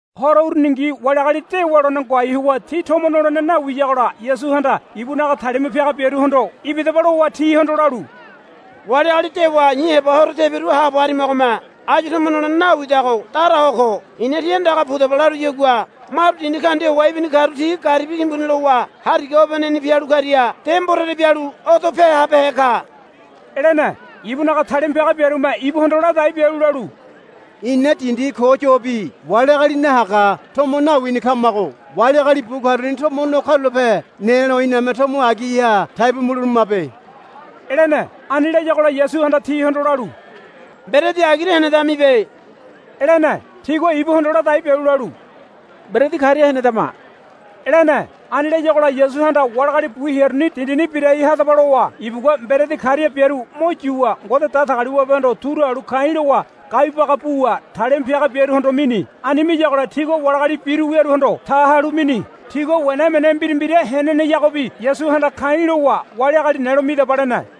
Horo uruningi wali agali dewa lone ngoai howa ti tomo nolene nawiyagola Yasuhanda ibunaga talima piaga biaruhondo, Ibidaba, lowa tihondo lalu, Wali agali dewa i̱ heba horo tebiru haabo harimagome áyu tomo nolene nawidago dara ho ko. I̱na, Tí andaga pudaba, laruyagua maru dindi kaundia howa ibini karu ti garibi timbuni lowa hariga obeneni pialu karia de mborere bialu odope habehe ka, lene. Ibunaga talima piaga biarume ibuhondo ladai bialu lalu, Ina dindi ko yobi wali agali nahaga tomo nawini kamago wali agali bu karuni tomo no karulape nelo iname tomo agiha taibu muleberamabe, lene. Ani layagola Yasuhanda tihondo lalu, Mberedi agira henedamibe, lene. Tigua ibuhondo ladai bialu lalu, Mberedi karia henedama, lene. Ani layagola Yasuhanda wali agali bu hearuni, Dindini birai hadaba, lowa ibugua mberedi karia biaru mo yuwa Ngode Datagaliwabehondo turu halu ka̱i̱ lowa gaibu baga buwa talima piaga biaruhondo mini. Ani miyagola tigua wali agali biru wiaruhondo ta halu mini. Tigua wena emene mbira mbira heneneyagobi Yasuhanda ka̱i̱ lowa, Wali agali nelo midaba, lene.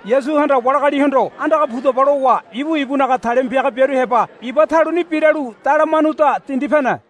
Yasuhanda wali agalihondo, Andaga pudaba, lowa ibu ibunaga talima piaga biaru heba iba taluni biralu Dalamanuda dindi pene.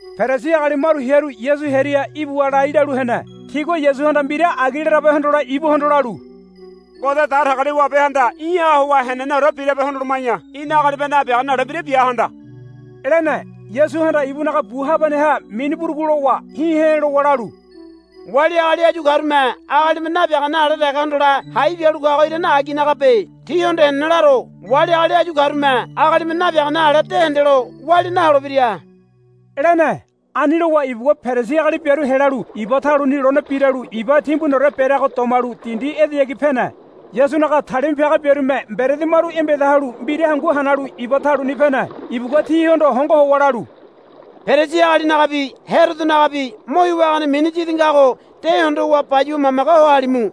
Perisi agali maru hearu Yasu hearia ibuwa lai lalu hene. Tigua Yasuhanda mbira agi larabe hondole ibuhondo lalu, Ngode Datagaliwabehanda í̠ha howa heneneore birabe hondoloma̱ya í̠na agalime nabiagane ale mbira bia handa, lene. Yasuhanda ibunaga bu habaneha mini burugu lowa hi̱ he̱ lowa lalu, Wali agali áyu karume agalime nabiagane ale dege hondole hai bialu kago irane aginagabe. Tíhondo henene laro wali agali áyu karume agalime nabiagane ale de hendelo walia naholebira, lene. Ani lowa ibugua Perisi agali biaru helalu iba taluni lone biralu iba timbuniore bereago domalu dindi edeyagi pene. Yasunaga talima piaga biarume mberedi maru embeda halu mbira hangu hanalu iba taluni pene. Ibugua tihondo hongo howa lalu, Perisi agalinagabi Herodonagabi mo hiwa hagane mini yidi ngago de hondowa bayuwa mamage ho halimu,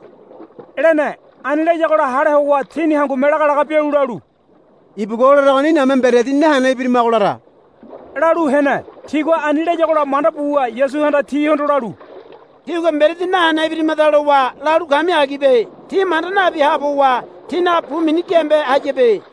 lene. Ani layagola hale howa tini hangume laga laga bialu lalu, Ibugua o laragoni iname mberedi nahene ibirimago lara, lalu hene. Tigua ani layagola manda buwa Yasuhanda tihondo lalu, Tígua mberedi nahene ibirimada lowa lalu kami agibe. Tí manda nabi haabo howa tínaga bu mini giambe hayabe.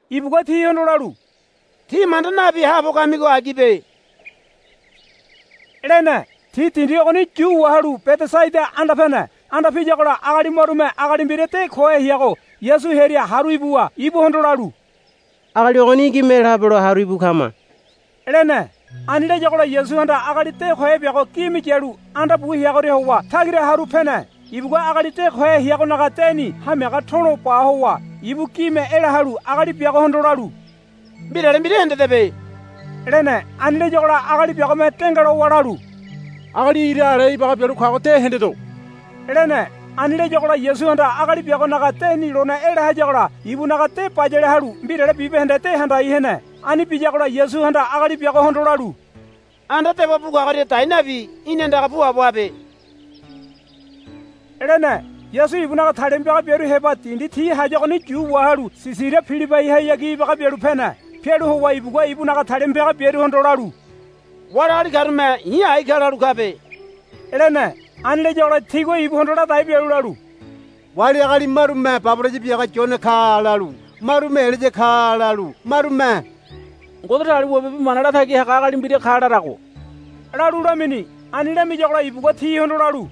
Ibugua tihondo lalu, Tí manda nabi haabo kamigo agibe, lene. Ti dindi ogoni yu wahalu Bedesaida anda pene. Anda piyagola agali marume agali mbira de kohe heago Yasu hearia haru ibuwa ibuhondo lalu, Agali ogoni í̠ gime ela habelo haru íbu kama, lene. Ani layagola Yasuhanda agali de kohe biago gime yalu anda bu heagoria howa tagira haru pene. Ibugua agali de kohe heagonaga deni hamiaga tolo ba howa ibu gime ela halu agali biagohondo lalu, Mbirale mbira hendedebe, lene. Ani layagola agali biagome dengalowa lalu, Agali ira ale ibaga bialu kago de hendedo, lene. Ani layagola Yasuhanda agali biagonaga deni lone ela hayagola ibunaga de bayale halu mbirale bibahende de handai hene. Ani biyagola Yasuhanda agali biagohondo lalu, Anda dewa bu kagoria dai nabi í̠ni andaga puabo habe, lene. Yasu ibunaga talima piaga biaru heba dindi ti hayagoni yu wahalu Sisaria Pilibaihayagi ibaga bialu pene. Pialu howa ibugua ibunaga talima piaga biaruhondo lalu, Wali agali karume i̱ ai ka lalu kabe, lene. Ani layagola tigua ibuhondo ladai bialu lalu, Wali agali marume, Baboraya biaga Yone ka, lalu marume, Elaya ka, lalu marume, Ngode Datagaliwabe bi mana latagi haga agali mbira ka, larago, lalu lamini. Ani lamiyagola ibugua tihondo lalu,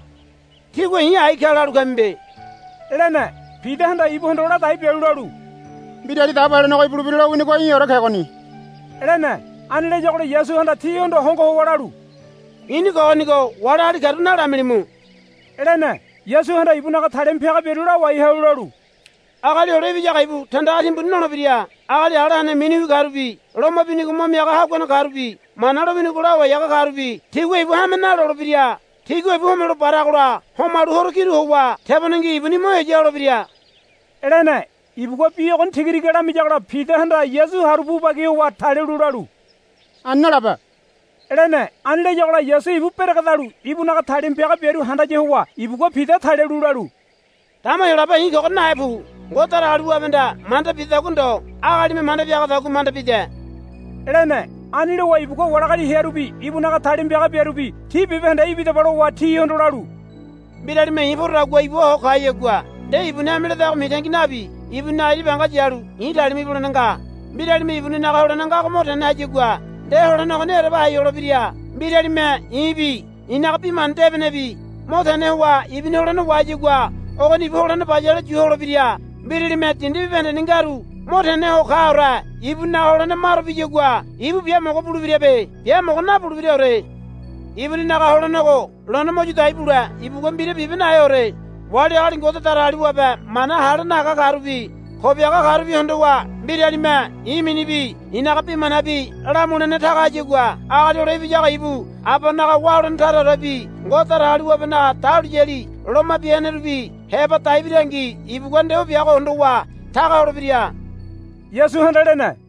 Tígua i̱ ai ka lalu kamibe, lene. Pidahanda ibuhondo ladai bialu lalu, Mbirali Dabo Helenego ibulebira lowinigo í̠ore kegoni, lene. Ani layagola Yasuhanda tihondo hongo howa lalu, I̱ni kogonigo wali agali karu nalamilimu, lene. Yasuhanda ibunaga talima piaga biaru lawai halu lalu, Agali Hole Ibiyago ibu tandaga timbuni nolebira. Agali ala hene miniwi karubi loma binigo mo miaga haguane karubi Mana lowinigo lawai haga karubi tigua ibu hame nalolebira. Tigua ibu homelo baragola homalu horo kiru howa tebonengi ibuni mo heya holebira, lene. Ibugua bi ogoni tigatiga lamiyagola Pidahanda Yasu haru pu bagi howa talialu lalu, Ani nalabe, lene. Ani layagola Yasu ibu beregedalu ibunaga talima piaga biaru handaya howa ibugua Pida talialu lalu, Dama Heyolabe i̱ kogoria nahe pu. Ngode Datagaliwabehanda manda bidadagua ndo agalime manda biagadagua manda bide, lene. Ani lowa ibugua wali agali hearubi ibunaga talima piaga biarubi, Tí bibahende ibidaba, lowa tihondo lalu, Mbiralime i̱ porodagua ibua ho kayagua nde ibuni hame ledago mitangi nabi ibuninaga ira banga yalu i̱ talima ibulene nga. Mbiralime ibuninaga holene ngago mo tene hayagua nde holene ogoni ereba hai holebira. Mbiralime i̱bi i̱naga bi mana debenebi mo tene howa ibuni holene wahayagua ogoni ibu holene bayale yu holebira. Mbiralime dindi bibahendeni ngaru mo teneho kaore ibuninaga holene maro biyagua ibu biamogo bulebirabe. Biamogo nabulebiraore. Ibuninaga holenego lone mo yu dai bule ibugua mbira bibe naheore. Wali agali Ngode Datagaliwabe mana hale nahaga karubi ko biaga karubi hondowa mbiralime i̱ minibi i̱naga bi manabi lamulene taga hayagua Agali Hole Ibiyago ibu Abanaga wá holene taraorebi Ngode Datagaliwabenaga dahuliyali loma bia henerubi heba dai birangi ibugua nde o biago hondowa taga holebira, Yasuhanda lene.